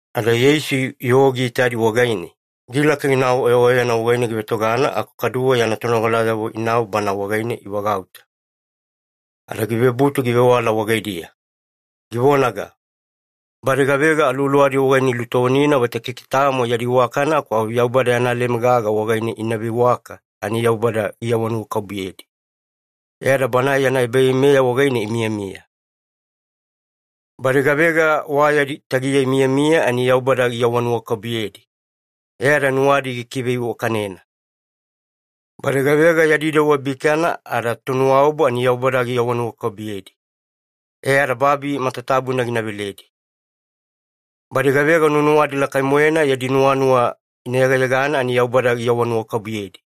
Ada Yeisu yoo giitadi wagaine, gilaka ginau oyaoyana wagaine givetogana aku kaduwe yana tonogalayavo inau Bana wagaine ivagauta. Ada givebutu givewala wagaidiya, givonaga, “Badi gavega aluwaluwadi wagaine ilutovonina vaita keke tamo yadi iwakana aku au Yaubada yana leme gaga wagaine ina veiwaka, ani Yaubada giawanuwakabubuyedi, e ada Banae yana ebaveimeya wagaine imiyamiya. “Badi gavega wa yadi tagiya imiyamiya ani Yaubada giawanuwakabubuyedi, e ada nuwadi gina kiveiwakanena. “Badi gavega yadi dewa bikana ada tonuwaobu ani Yaubada giawanuwakabubuyedi, e ada babi matatabuna gina veledi. “Badi gavega nuwanuwadi lakai-moena yadi nuwanuwa ina yegayegana ani Yaubada giawanuwakabubuyedi,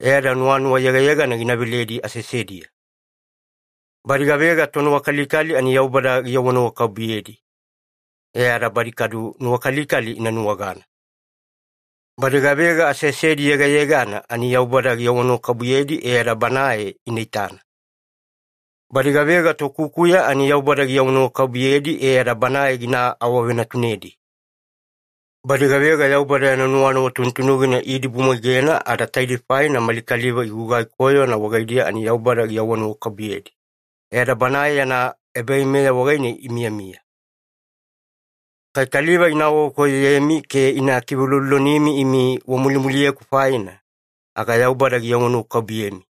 e ada nuwanuwa yegayegana gina veledi aseasediya. “Badi gavega tonuwakalikali ani Yaubada giawanuwakabubuyedi, e ada badi kadu nuwakalikali ina nuwagana. “Badi gavega aseasedi yegayegana ani Yaubada giawanuwakabubuyedi, e ada Banae ina itana. “Badi gavega tokukuya ani Yaubada giawanuwakabubuyedi, e ada Banae gina awavenatunedi. “Badi gavega Yaubada yana nuwanuwa tunutunugina iidibumwaigena ada taidei faina mali kaliva igugai koyona wagaidiya, ani Yaubada giawanuwakabubuyedi, e ada Banae yana ebaveimeya wagaine imiyamiya. “Kai kaliva ina awavekoyoyemi ke ina kiveulolonimi imi wamulimuliyeku faina, aga Yaubada giawanuwakabubuyemi.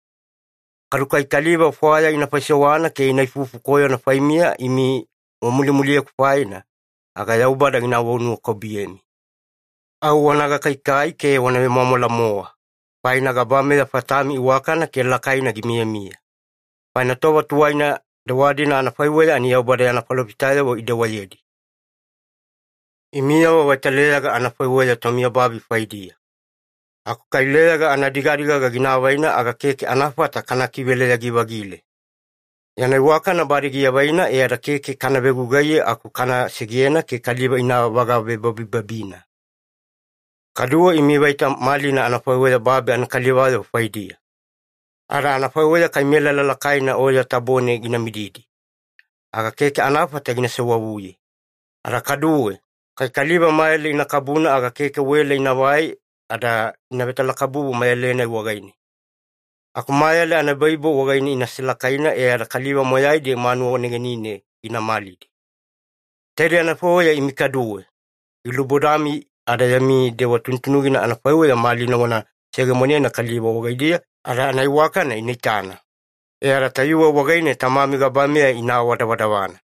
Kadu kai kaliva fwaya ina faisewana ke ina ifufu koyona faimiya imi wamulimuliyeku faina, aga Yaubada giawanuwakabubuyemi. Au wana gakaikai ke wana vemwamwala-mowa, faina gabameya fatami iwakana ke lakaina gimiyamiya. Faina tova tuwaina dewa-dina anafaiweya ani Yaubada yana falofitayavo idewayedi. “Imiyavo vaita leyaga anafaiweya tomiyababi faidiya. Aku kai leyaga anadigadigaga gina avaina, aga keke anafata kana kiveleyagi-vagile. Yana iwakana bade giavaina e ada keke kana vegugaiye, aku au kana segena ke kaliva ina vagavebabibabina. “Kaduwe imi vaita malina anafaiweya babi anakalivayavo faidiya. Ada anafaiweya kai melala lakaina oya tabone gina mididi, aga keke anafata ina sewavuye. Ada kaduwe, kai kaliva mayale ina kabuna, aga keke wela inavai ada ina vetalakabubu mayale-nai wagaine. Aku mayale anaebaibo wagaine ina selakaina e ada kaliva moyaidi manuwa negenine gina malidi. Taidei anafaiweya imi kaduwe. Gilubodami ada yami dewa tunutunugina anafaiweya malina wana seyegemonena kaliva wagaidiya ada anaiwakana ina itana, e ada tayuwe wagaine Tamami gabameya ina awadavadavana.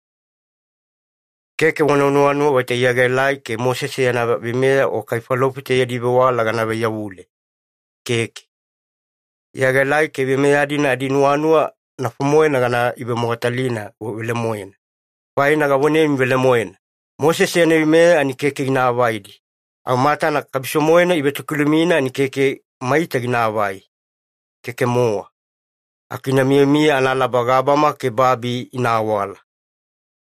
“Keke wana nuwanuwa vaita Iya gaelai ke Mosese yana veimeya o kai falofita yadi vewala gana vaiyavule, keke. Iya gaelai ke veimeya-dina adinuwanuwa nafo-moena gana ivemogatalina velemoena. Faina gavonemi velemoena, Mosese yana veimeya ani keke gina avaidi, au matana kabiso-moena ivetokilumina ani keke maita ginaavai. Keke-mowa. Aku ina miyamiya analaba gabama ke babi ina awala.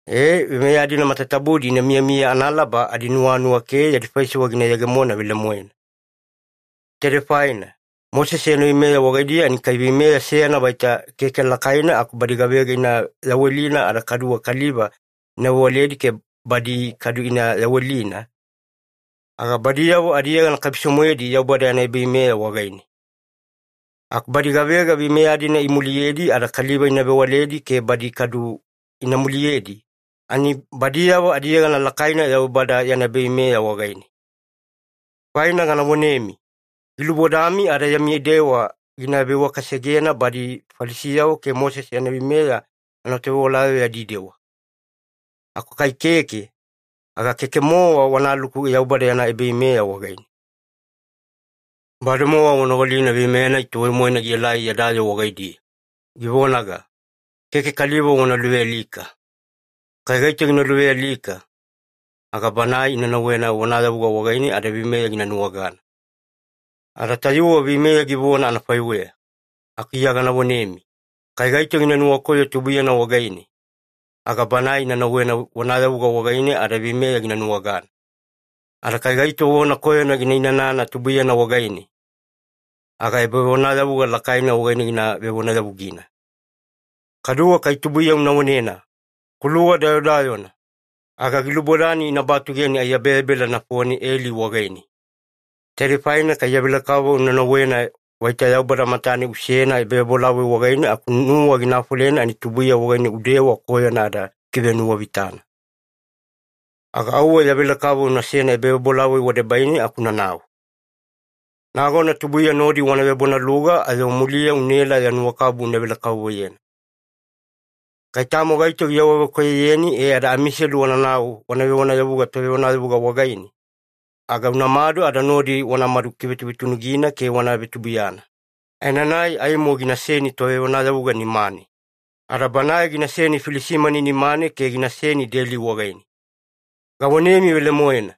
Ee, veimeya-dina matatabudi ina miyamiya analaba adinuwanuwa ke yadi faisewa gina yegemona velemoena. Taidei faina, Mosese yana veimeya wagaidiya, ani kai veimeya seyana vaita keke lakaina aku badi gavega ina yawelina ada kaduwe kaliva ina vewaledi ke badi kadu ina yawelina, aga badiyavo adiyegana kabiso-moedi Yaubada yana ebaveimeya wagaine. Aku badi gavega veimeya-dina ina muliyedi ada kaliva ina vewaledi ke badi kadu ina muliyedi, ani badiyavo adiyegana lakaina Yaubada yana ebaveimeya wagaine. Faina gana vonemi, gilubodami ada yami dewa gina veiwakasegena badi Falisiyavo ke Mosese yana veimeya anatovewalayavo yadi dewa. Aku kai keke, aga keke-mowa wanaluku Yaubada yana ebaveimeya wagaine. “Bademowa wanogalina veimeya-nai tuwai-moena gielai yada yoo wagaidiya, givonaga, ‘Keke kaliva wana luvealika. Kai gaito gina luvealika, aga banae ina nauwena vonayavuga wagaine ada veimeya gina nuwagana.’ Ada tayuwe veimeya givona anafaiweya, aku Iya gana vonemi, kai gaito gina nuwakoyo tubuiyana wagaine, aga banae ina nauwena vonayavuga wagaine ada veimeya gina nuwagana. Ada kai gaito vona koyona gina inanana tubuiyana wagaine, aga ebavonayavuga lakaina wagaine ina vevonayavugina. Kaduwe kai tubuiya una vonena ‘Kuluwa dayodayona,’ aga gilubodani ina batugeni aiyabeyabela nafone eli wagaine. Taidei faina kai ya velekavovo una nauwena vaita Yaubada matane unasena ebavebolavoi wagaine, aku nuwa gina afolena ani tubuiya wagaine udewa koyona ada ukivenuwavitana, aga auwe ya velekavovo unasena ebavebolavoi wadebaine aku unanau. Nagona tubuiya nodi wana vebonaluga, ayo muliya unaela ya nuwakabubu una velekavovoyena. “Kai tamo gaito giawavekoyoyeni e ada amiselu wanauna wana vonayavuga tovevonayavuga wagaine, aga unamadu ada nodi wanamadu kivetuvetunugina ke wana vetubuiyana, aenanai aimo ginaseni tovevonayavuga nimane, ada banae ginaseni filisimani nimane ke ginaseni deli wagaine. Gavonemi velemoena,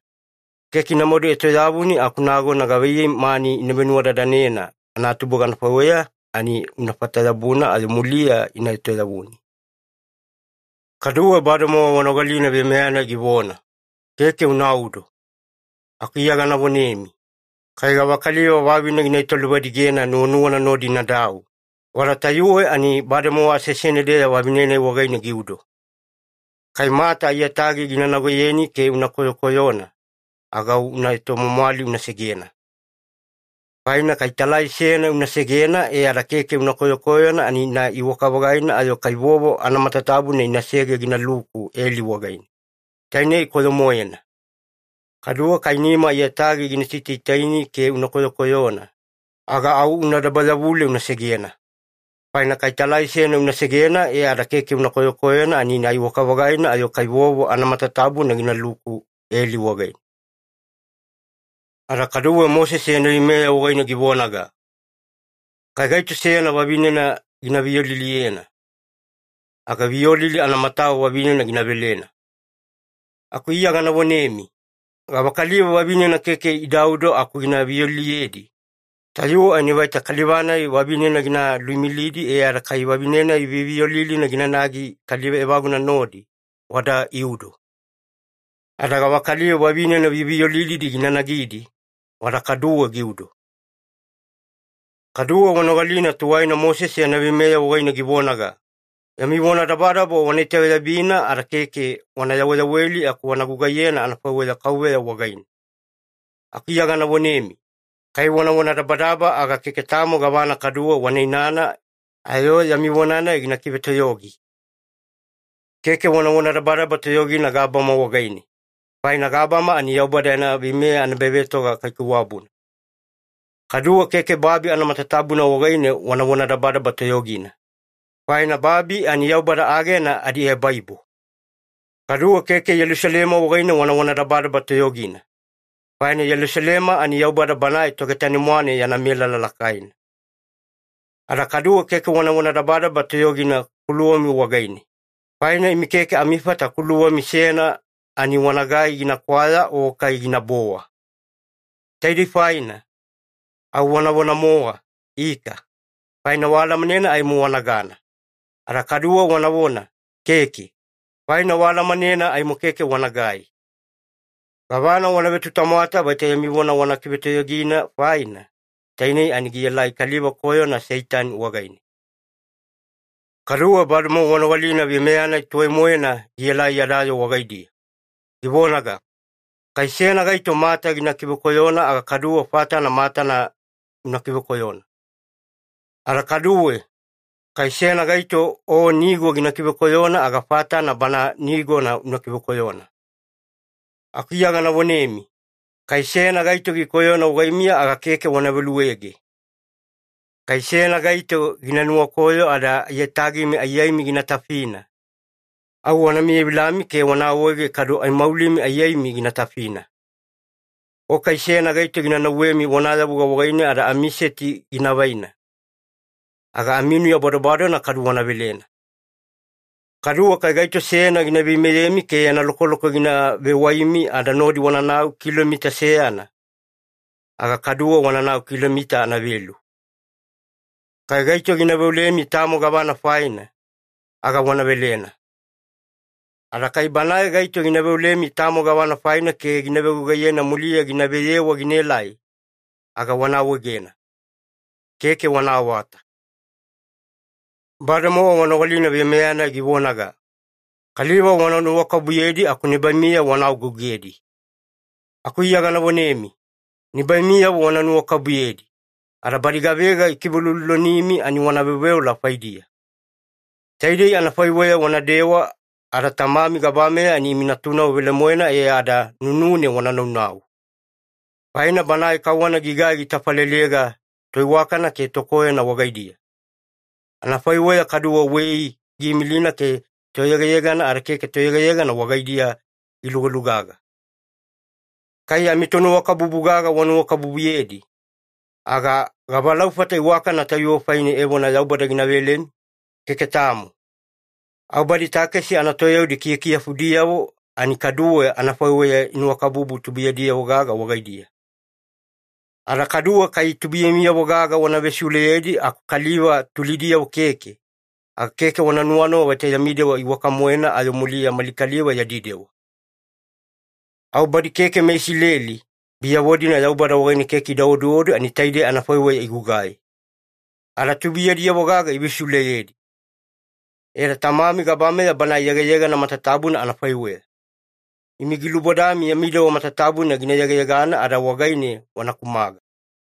keke inamadu etoyavuni aku nagona gavaiyei mani ina venuwadadanena anatubuga anafaiweya, ani unafata-yabuna ayo muliya ina etoyavuni. “Kaduwe bademowa wanogalina veimeya-nai givona, ‘Keke unaudo.’ Aku Iya gana vonemi, kai gavakaliva vavine gina italuvadigena nuwanuwana nodi inadau, wada tayuwe ani bademowa aseasene-deya vavine-nai wagaine giudo. Kai mata aiyatagi gina nagoyeni ke una koyokoyona, aga au una etomwamwali una segena. Faina kai talai seyana una segena e ada keke una koyokoyona, ani ina iwaka-vagaina ayo kai vovo anamatatabuna inasege ginaluku eli wagaine. Tainei koyo-moena. Kaduwe kai nima aiyatagi gina sitaitaini ke una koyokoyona, aga au una dabayavule una segena. Faina kai talai seyana una segena e ada keke una koyokoyona, ani ina iwaka-vagaina ayo kai vovo anamatatabuna ginaluku eli wagaine. “Ada kaduwe Mosese yana veimeya wagaine givonaga, ‘Kai gaito seyana vavinena gina viyoliliyena, aga viyolili anamatawa vavinena gina velena.’ Aku Iya gana vonemi, gavakaliva vavinena keke idaudo aku gina viyoliliyedi, tayuwe ani vaita kaliva-nai vavinena gina luimilidi e ada kai vavine-nai viyoviyolilina ginanagi kaliva evaguna nodi, wada iudo. Ada gavakaliva vavine viyoviyolilidi gina nagidi, wada kaduwe giudo. “Kaduwe wanogalina tuwaina Mosese yana veimeya wagaine givonaga, ‘Yami vonadabadaba wana itaveyabina ada keke wana yaweyaweli, aku wana gugaiyena anafaiweya KAUVEYA wagaine.’ Aku Iya gana vonemi, kai wana vonadabadaba, aga keke tamo gavana kaduwe wana inainana ayo yami vona-nai gina kivetoyogi. Keke wana vonadabadaba toyogina gabama wagaine, faina gabama ani Yaubada yana veimeya anaebavetoga kaikaiwabuna. Kaduwe keke babi anamatatabuna wagaine wana vonadabadaba toyogina, faina babi ani Yaubada agena adiebaibo. Kaduwe keke Yelusalema wagaine wana vonadabadaba toyogina, faina Yelusalema ani Yaubada banae Togetane-mwane yana melala lakaina. Ada kaduwe keke wana vonadabadaba toyogina kuluwami wagaine, faina imi keke amifata kuluwami seyana ani wanagai gina kwaya o kai ginabowa. Taidei faina, au wanavona-mowa ‘ika’, faina waalamanena aimo wanagana. Ada kaduwe wanavona ‘keke’, faina waalamanena aimo keke wanagai. Gavana wana vetutamwata vaita yami vona wana kivetoyogina faina, tainei ani gielai kaliva koyona Seitani wagaine. “Kaduwe bademowa wanogalina veimeya-nai tuwai-moena gielai yada yoo wagaidiya, givonaga, ‘Kai seyana gaito mata gina kivekoyona, aga kaduwe fatana matana una kivekoyona’. Ada kaduwe, ‘Kai seyana gaito o nigo gina kivekoyona, aga fatana bana nigona una kivekoyona’. Aku Iya gana vonemi, kai seyana gaito gikoyona wagaimiya, aga keke wana veluege. Kai seyana gaito gina nuwakoyo ada aiyatagimi aiyaimi gina tafina, au wana miyavilami ke wana awaege kadu aimaulimi aiyaimi gina tafina. O kai seyana gaito gina nauwemi vonayavuga wagaine ada amiseti gina vaina, aga aminuya badobadona kadu wana velena. Kaduwe kai gaito seyana gina veimeyemi ke yana lokoloko gina vewaimi ada nodi wananau kilomita seyana, aga kaduwe wananau kilomita anavelu. Kai gaito gina veolemi tamo gavana faina, aga wana velena. Ada kai banae gaito gina veolemi tamo gavana faina ke gina vegugaiyena muliya gina veyewa ginaelai, aga wana awaegena. Keke wana awata. “Bademowa wanogalina veimeya-nai givonaga, ‘Kaliva wana nuwakabubuyedi aku nibaimiyavo wana agougedi.’ Aku Iya gana vonemi, Nibaimiyavo wana nuwakabubuyedi, ada badi gavega ikiveuloulolonimi ani wana veoveola faidiya. Taidei anafaiweya wanadewa ada Tamami gabameya ani imi natunavo velemoena e ada nunune wanaunau. Faina Banae kauwana gigai gitafalelega toiwakana ke tokoyona wagaidiya, anafaiweya kaduwe wei giimilina ke toyegayegana ada keke toyegayegana wagaidiya gilugalugaga. Kai amitonuwakabubu gaga wanuwakabubuyedi, aga gavalaufata iwakana tayuwe faine evona Yaubada gina velemi? Keke tamo. Au badi takesi anatoyaudi kiyakiyafudiyavo, ani kaduwe anafaiweya inuwakabubu tubuiyadiyavo-gaga wagaidiya. Ada kaduwe, kai tubuiyamiyavo-gaga wana vesiuleyedi aku kaliva tulidiyavo keke, aga keke wana nuwanuwa vaita yami dewa iwaka-moena ayo muliya mali kaliva yadi dewa. Au badi keke meIsileli, biyavo-dina Yaubada wagaine keke ida oduodu, ani taidei anafaiweya igugai, ada tubuiyadiyavo-gaga ivesiuleyedi. E ada Tamami gabameya Banae yegayegana matatabuna anafaiweya, imi gilubodami yami dewa matatabuna gina yegayegana ada wagaine wana kumaga.